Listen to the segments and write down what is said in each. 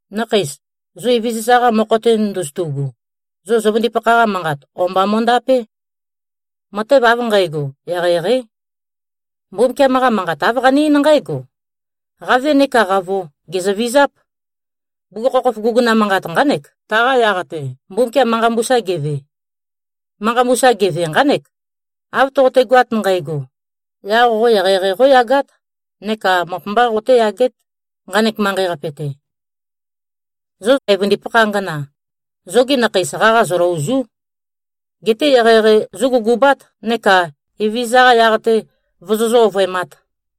Nakheis, zo Evezøza-qa mokho-te ndozotu꞉gu, zo zøvøndipakha-qa manqat o-mba mo꞉ndapé. Matev av nqægo, eqeieqeí. Mbumbukiam-qa Manqat āv qane-eín nqǽgo, “Qave nekā qavo, gèzøvizáp.” Bugukhokhof guguna manqat nqánek, taqa yaq-te, Mbumbukiam manqa mbusa geve. Manqa mbusa geve, nqánek, “Av toqotegoat nqægo, yaq qo eqeieqei qóyagát neka møp-mbá qotéyagét, nqanek manqei-qape-te.” Zo evøndipakha angana, zogi nakheis qaqa zøløòzu᷄. Geté eqeieqei zógugubát neka Evezøza-qa yaq-te vozozǿ-ovøemāt.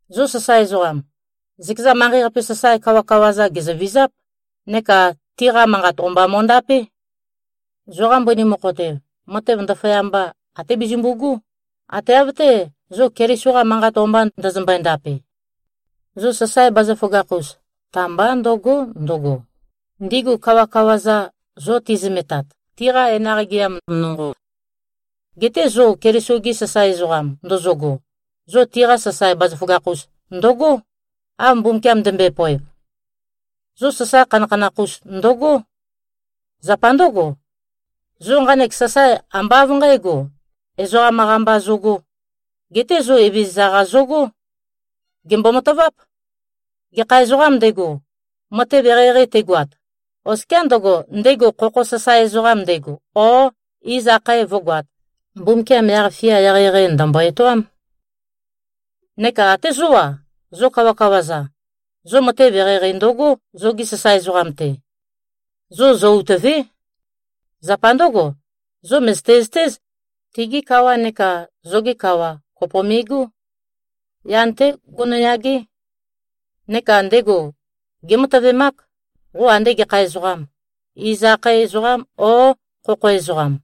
Zo sasae ezoqam, zøkeza manqei-qape sasae kawakawa-za, gèzøvizáp, neka tiqa manqat o-mba mo꞉ndapé. Zoqa mbøni mokho-te, matev ndaføyamba até bezømbu꞉gú, ate av-té, zo Keliso-qa manqat o-mba ndøzømbøe-ndape. Zo sasae bazaføgakh-us, ta-mbá ndø̀go᷄ ndøgo, ndigu kawakawa-za, zo tizømetat, tiqa enaq gɨam nonqo. Geté zo Keliso-gi sasae ezoqam ndozogo, zo tiqa sasae bazaføgakh-us ndøgó, av Mbumbukiam ndømbøe-poev. Zo sasae khanakhanakh-us ndøgó. Zapa ndǿgo, zo nqanek sasae, ambá av nqǣgo, ezoqam-qa mba zogō, geté zo Evezøza-qa zogó. Gèmbo-mataváp. Gekha ezoqām ndego, matev eqeieqei tegoat, oskiá ndøgo, ndego khokho sasae ezoqam ndego o iz akhae vǿgoāt, Mbumbukiam yaq-fia eqeieqei, ndø̀mbo-etoám. Neka até zó-a, zo kawakawa-za, zo matev eqeieqei ndøgó, zogi sasae ezoqam-te. Zo zø-utø̀ve᷄. Zapa ndǿgo, zo mø̀zøte-zøtéz, tigi kawa neka zoge kawa, kopo me꞉gó. Yan-té gonoyagé. Neka ndego gématøvemák, qo ande gekha ezoqam, iz akhae ezoqām, ō, khokho ezoqam.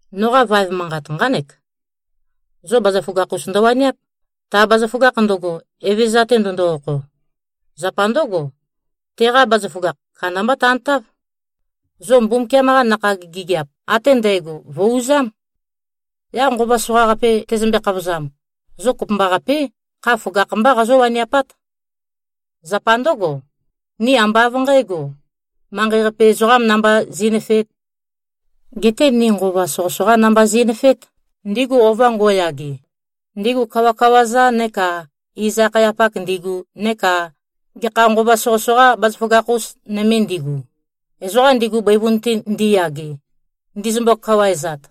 Noqa vaev manqat nqánek: Zo bazaføgakh-us ndøwaniáp, ta bazaføgakh ndøgo, Evezøza-te ndøndo-okho. Zapa ndǿgo, teqa bazaføgakh, kandambá tantáv. Zo Mbumbukiam-qa nakhag gigiap ate ndægo, vø̀-uzám. Yaq nqova soqaqape tezømbe-khavozam, zo kopømbaqapé, kha føgakh-mbá qazó-waniapát. Zapa ndǿgo, ni ambá av nqægo, manqei-qape ezoqām namba zi꞉nøfeēt. Geté ni nqova soqøsoqá namba zi꞉nøfeét, ndigu ova ngo꞉yage, ndigu kawakawa-za neka iz-akhayapak ndigu neka gekha nqova soqøsoqa bazaføgakh-us nøme ndigu, ezoqa ndigu bøivun-te ndiyage, ndizømbo-kawaezat.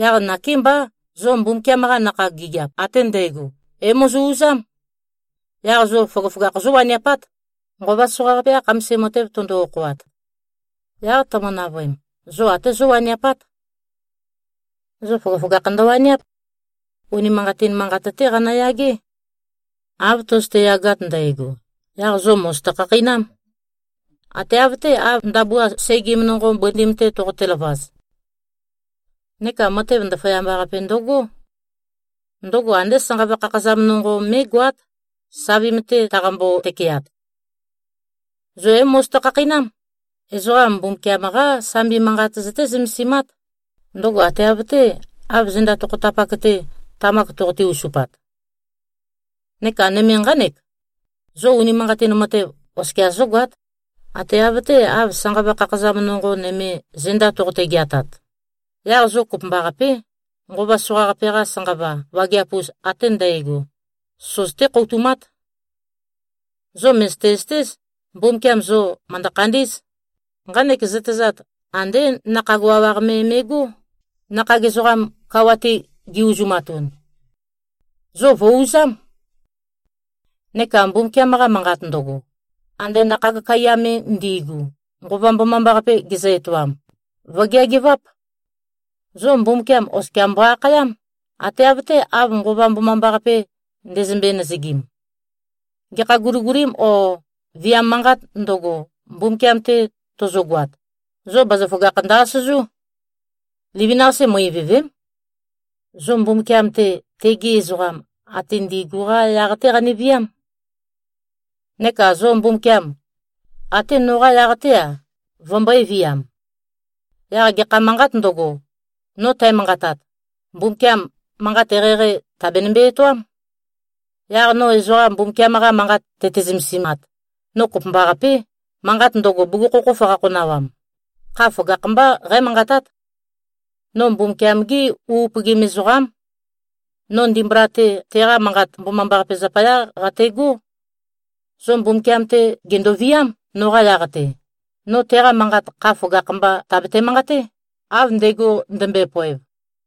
Yaq nakémbá, zo Mbumbukiam-qa nakhag gigiap ate ndægo, é-mozo-uzám. Yaq zo føgøføgakh zówaniapát, nqova soqaqape-qa khamasim matev tøndo-okhoat. Yaq tømø-navøem, zo até zówaniapát. Zo føgøføgakh ndøwaniáp. Unimanqatin manqat-té qanøyagé. Av tøzøte-yagat ndægo, yaq zo mòzoto-khakheinám. Ate av-té, av ndabua segim nonqo, bøndim-te toqote-løvaz. Neka matev ndaføyamba-qape ndøgó. Ndøgo andé sanqava khakhazam nonqo me mé꞉goát, savim-te taqambo-tøkeat. Zo é-mozoto-khakheinám. Ezoqa Mbumbukiam-qá Sambi Manqat zøté-zømesimát. Ndøgo ate av-té, av zenda tokhotapak-te, tamak toqote-uzupat. Neka nøme nqánek: Zo unimanqatin matev oskia zǿgoát. Ate av-té, av sanqava khakhazam nonqo nøme, zenda toqote-geatat. Yaq zo kopømbaqapé, nqova soqaqape-qa sanqava wageap-us ate ndægo, søzøté-khoutumát. Zo mø̀zøte-zøtéz, Mbumbukiam zo mø̀ndø-khandí꞉z. Nqanek zøtezat, andé nakhag wawaq me me꞉gó, nakhag ezoqam kawa-te gi-uzumatun. Zo vø̀-uzám. Neka Mbumbukiam-qa Manqat, ndøgo ande nakhag kaiya me ndi꞉gu, Nqova Mbomambaqape gezø-etoam, vø̀geageváp. Zo Mbumbukiam oskia mbo-akhayám, ate av-té, av Nqova Mbomambaqape ndezømbe-nøzøgim. Gekha guligulim o viam manqāt ndøgo, Mbumbukiam-te tozogoat, zo bazaføgakh ndø-asøzú. Livin-qase, mø-ivø̀ve᷄m. Zo Mbumbukiam-te, tegi ezoqam ate ndi꞉gu-qá yaq-té qaneviám. Neka zo Mbumbukiam, até noqá yaq-té-a, vømbø̄e-viam. Yaq gekha manqāt ndøgo, no tæmanqatat, Mbumbukiam manqat eqeieqei, tèabenømbe-etoám. Yaq no ezoqa Mbumbukiam-qa Manqat tøte-zømesimat, no kopømbaqapé, manqat ndøgo, bugukhokhof qakhonawam, kha føgakh-mbá qǽmanqatát. No Mbumbukiam-gé u upøgim ezoqám. No ndimbula-te, teqa Manqat Mbomambaqape zapayá qategó. Zo Mbumbukiam-te gèndoviám, noqa yaq-te, no teqa manqat kha føgakh-mba tàbate-manqaté, av ndego ndømbøe-poev.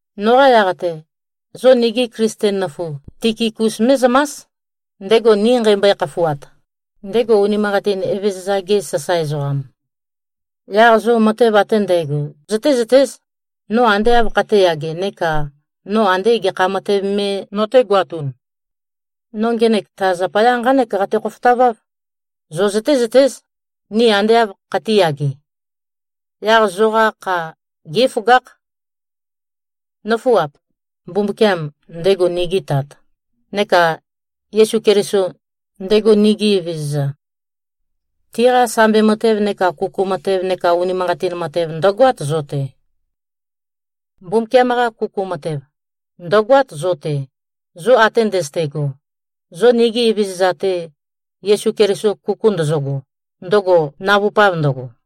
Noqa yaq-te, zo nigi Klisten nøfu Tikikus mé꞉zømás, ndego ni nqeimbøe-khafuat, ndego unimanqatin Evezøza-ge sasae ezoqam. Yaq zo matev ate ndægo zøtézøtéz, no ande āv khatēyage neka no andē gekha matev me notēgoatun. No ngenek ta zapaya nqánek qate-khofotaváv: Zo zøtézøtéz, ni ande āv khatīyage. Yaq zoqa kha gé꞉føgákh. Nǿfuap! Mbumbukiam, ndego nigi Tat, neka Yesu Keliso, ndego nigi Evezøza, tiqa sambi matev neka kuku matev neka unimanqatin matev, ndø̀goát zo-te. Mbumbukiam-qa kuku matev, ndø̀goát zo-te, zo ate ndøzøte꞉go, zo nigi Evezøza-te, Yesu Keliso kuku ndøzøgo, ndøgo navupav ndøgo.